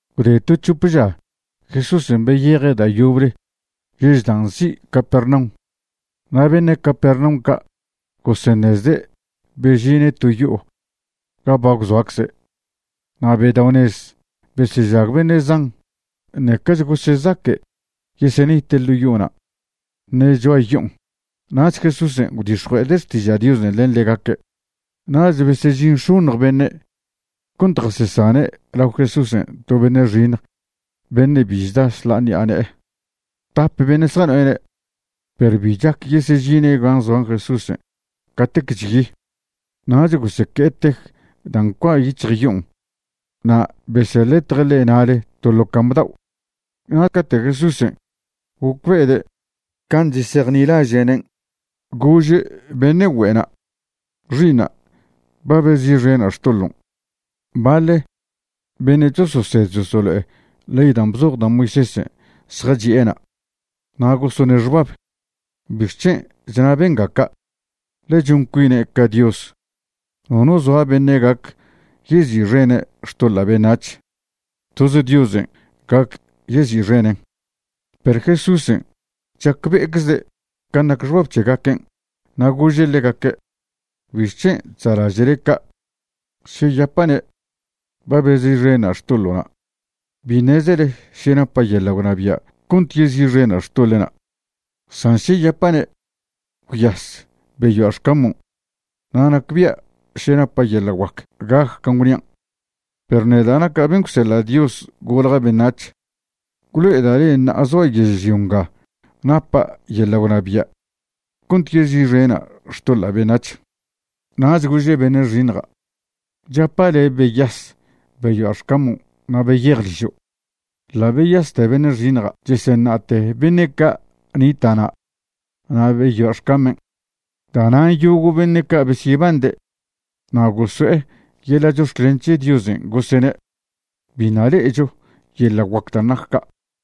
Gwde to c̱hop ža, Jesúsen' beyeje' da' yoble yež dan' nzi' Capernaum, na' beṉe' Capernaum ca' goseṉezde' bežine' to yo'o ga ba gwzoacze'. Na' bedao'nez besežag beṉe' zan, ṉecach gosezaque' yesenite' ḻo' yo'ona' ṉe cho'a yo'on, nach Jesúsen' gwdix̱jue'ede' xtiža' Diosen' len ḻegaque'. Nach besežin x̱oṉj beṉe' cont jasesane' lao Jesúsen' to beṉe' xiṉj beṉe' bi chda šḻa'a ṉi'a ne'e; tap beṉe' zjano'ene'. Perw bi chac yesežine' gan' zoa Jesúsen' catec chyi. Nach goseque'e tej dan' ncua' yic̱hj yo'on na' beseḻetje' ḻe' na'le to ḻo cam̱ dao'. Na' cate' Jesúsen' gocbe'ede' can' chesejnilaže'nen', gože' beṉe' güe'na': ―Xi'iṉa', ba bezi'xena' xtoḻon'. Baḻ beṉe' chososed chosolo'e ley dan' bzoj da' Moisésen' zjachi'e na', na' gosone' xbab: “¿Bixc̱hen' chna benga ca'? ḻe chon cuine' ca Dios. Nono zoa beṉe' gac yezi'xene' xtoḻa' beṉac̱h. Toz Diosen' gac yezi'xenen'.” Perw Jesúsen' chacbe'eczede' can' nac xbab c̱hegaquen', na' gože' ḻegaque': ―¿Bixc̱hen' chza'laže'le ca'? Še yapa'ne': “Ba bezi'xena' xtoḻo'na'”, bi ṉezele še napa' yeḻa' gwnabia' cont yezi'xena' xtoḻe'na', san še yapa'ne': “Gwyas, beyoa' xcamon'”, na' nacbia' še napa' yeḻa' guac gac can' gwnian'. Perw neda' naca' ben' gwseḻa' Dios golja' beṉac̱h, gwlo'eda' le'e ṉa'a zoa' yežlio nga napa' yeḻa' gwnabia' cont yezi'xena' xtoḻa' beṉac̱h. Nach gože' beṉe' xiṉja': ―Chapa' le', beyas, beyoa' xcamon' na' beyej ližo'. Ḻa' beyaste beṉe' xiṉja' cheseṉa'te beṉe' ca' nita'na' na' beyoa' xcamen'. Da'nan' yogo' beṉe' ca' besyebande' na' goso'e yeḻa' chox̱clen c̱he Diosen', gosene': ―Biṉa' le'echo yeḻa' guac dan' nac ca'.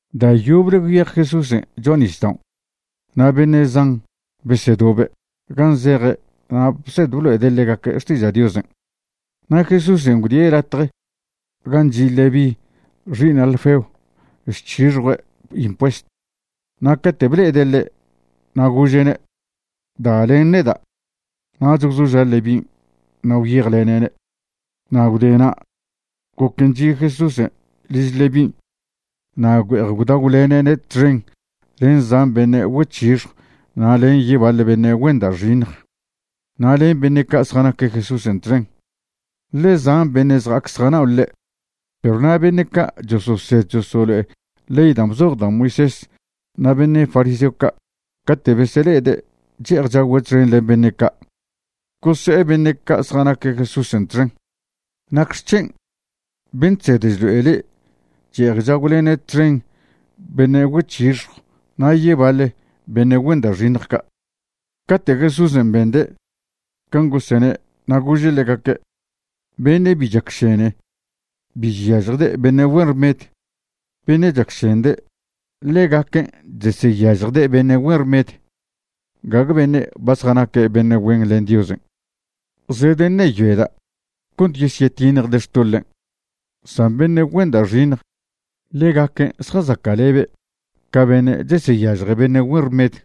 Da' yoble gwyej Jesúsen' cho'a nisdao' na' beṉe' zan besedobe' gan' zeje' na' bsed blo'ede' ḻegaque' xtiža' Diosen'. Na' Jesúsen' gwdie' latje gan' chi' Leví xi'iṉ Alfeo chc̱hixjue' impuesto, na' cate' ble'ede' ḻe' na' gože'ne': ―Da len neda'. Nach gwzoža' Levín' na' gwyejlene'ne'. Na' gwdena' goquen' chi' Jesúsen' liž Levín' na' güe'ej gwdagwlene'ne' txen len zan beṉe' güec̱hixjw na' len yebaḻ beṉe' güen da' xiṉj, na' len beṉe' ca' zjanaque' Jesúsen' txen, ḻe zan beṉe' zja'ac zjanao' ḻe'. Perw na' beṉe' ca' chososed chosolo'e ley dan' bzoj da' Moisés na' beṉe' fariseo ca' cate' besele'ede' che'ej chagüe' txen len beṉe' ca', gose'e beṉe' ca' zjanaque' Jesúsen' txen: ―¿Nacxec̱hen' ben' chsed chlo'e le'e che'ej chagwlene' txen beṉe' güec̱hixjw na' yebaḻ beṉe' güen da' xiṉj ca'? Cate' Jesúsen' bende' can' gosene' na' gože' ḻegaque': ―Beṉe' bi chesacšene bi cheseyažjde' beṉe' güen rmed. Beṉe' chesacšende', ḻegaquen' cheseyažjde' beṉe' güen rmed. Gague beṉe' ba zjanaque' beṉe' güen len Diosen' zedeṉeyoeda' cont yesyetiṉjde' xtoḻen', san beṉe' güen da' xiṉj. Ḻegaquen' zjazaca'lebe' ca beṉe' cheseyažje beṉe' güen rmed.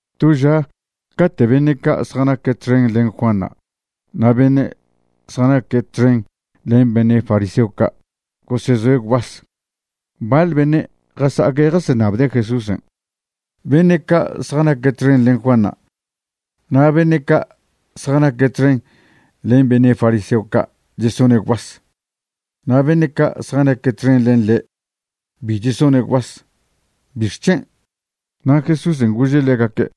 To ža cate' beṉe' ca' zjanaque' txen len Juanṉa' na' beṉe' zjanaque' txen len beṉe' fariseo ca' gosezoe' gwbas, baḻ beṉe' jasa'aque' jaseṉabde' Jesúsen': ―Beṉe' ca' zjanaque' txen len Juanṉa' na' beṉe' ca' zjanaque' txen len beṉe' fariseo ca' chesone' gwbas, na' beṉe' ca' zjanaque' txen len le' bi chesone' gwbas. ¿Bixc̱hen'? Na' Jesúsen' gože' ḻegaque':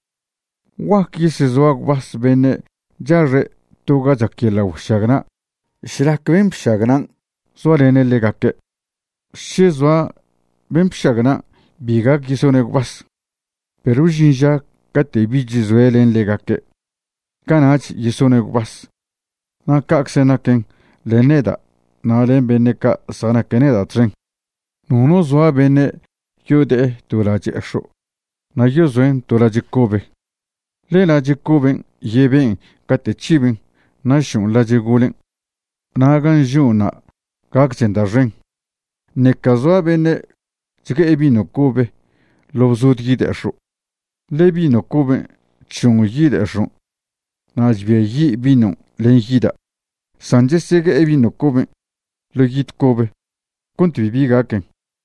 ―¿Guaque yesezoa gwbas beṉe' chaxe' to ga chac yeḻa' güešagna' šlac ben' bšagnan' zoalene' ḻegaque'? Še zoa ben' bšagnan', bi gac yesone' gwbas. Perw žin ža cate' bich zoe' len ḻegaque', cana'ch yesone' gwbas. Na' ca'czen' naquen len neda' na' len beṉe' ca' zjanaque' neda' txen. ’Nono zoa beṉe' yode'e to lache'ex̱o' na' yezoen' to lache' cobe, ḻe lache' coben' yeben' cate' c̱hiben' na' šon' lache' golen', na' gan' žoṉ'na' gacchen da' xen. Ṉeca zoa beṉe' chgue'e vino cobe ḻo' bzod yide'ex̱o', ḻe vino coben' chšon' yide'ex̱on' na' chbiayi' vinon' len yida'. San chesegue'e vino coben' ḻo' yid cobe cont bibi gaquen.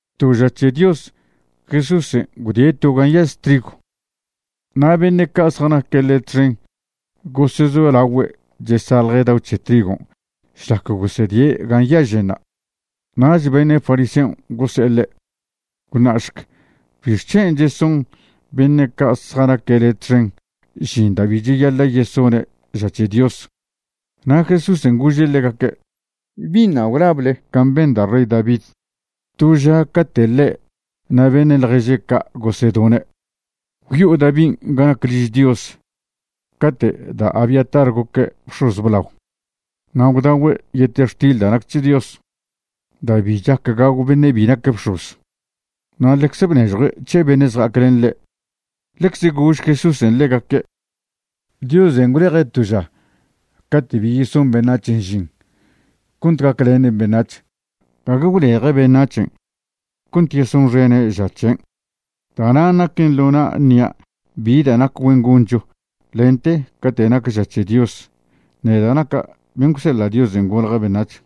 To ža c̱he Dios Jesúsen' gwdie' to ga nyaž trigw, na' beṉe' ca' zjanaque' ḻe' txen gosezolagüe' chesaḻje' dao c̱he trigon' šlac gosedie' gan' nyaženṉa'. Nach beṉe' fariseon' gose'e ḻe': ―Gwṉa'šc ¿bixc̱hen' cheson beṉe' ca' zjanaque' le' txen žin da' bi cheyaḻa' yesone' ža c̱he Dios? Na' Jesúsen' gože' ḻegaque': ―¿Biṉa' gwlable can' ben da' rey David to ža cate' ḻe' na' beṉe' ḻježe' ca' gosedone'? Gwyo'o Davin' ga nac liž Dios cate' da' Abiatar goque' bx̱oz blao, na' gwdagüe' yetextil da' nac c̱he Dios da' bi chac gagw beṉe' bi nac bx̱oz, na' ḻecze bnežjue' c̱he beṉe' zja'ac len ḻe'. Ḻecze gož Jesúsen' ḻegaque': ―Diosen' gwleje' to ža cate' bi yeson beṉac̱hen' žin cont gaclenen beṉac̱h, gague gwleje' beṉac̱hen' cont yesonxene' ža c̱hen'. Da'nan' naquen ḻo na' ṉia' bi da' nac güen goncho lente cate' nac ža c̱he Dios, neda' naca' ben' gwseḻa' Diosen' golja' beṉac̱h.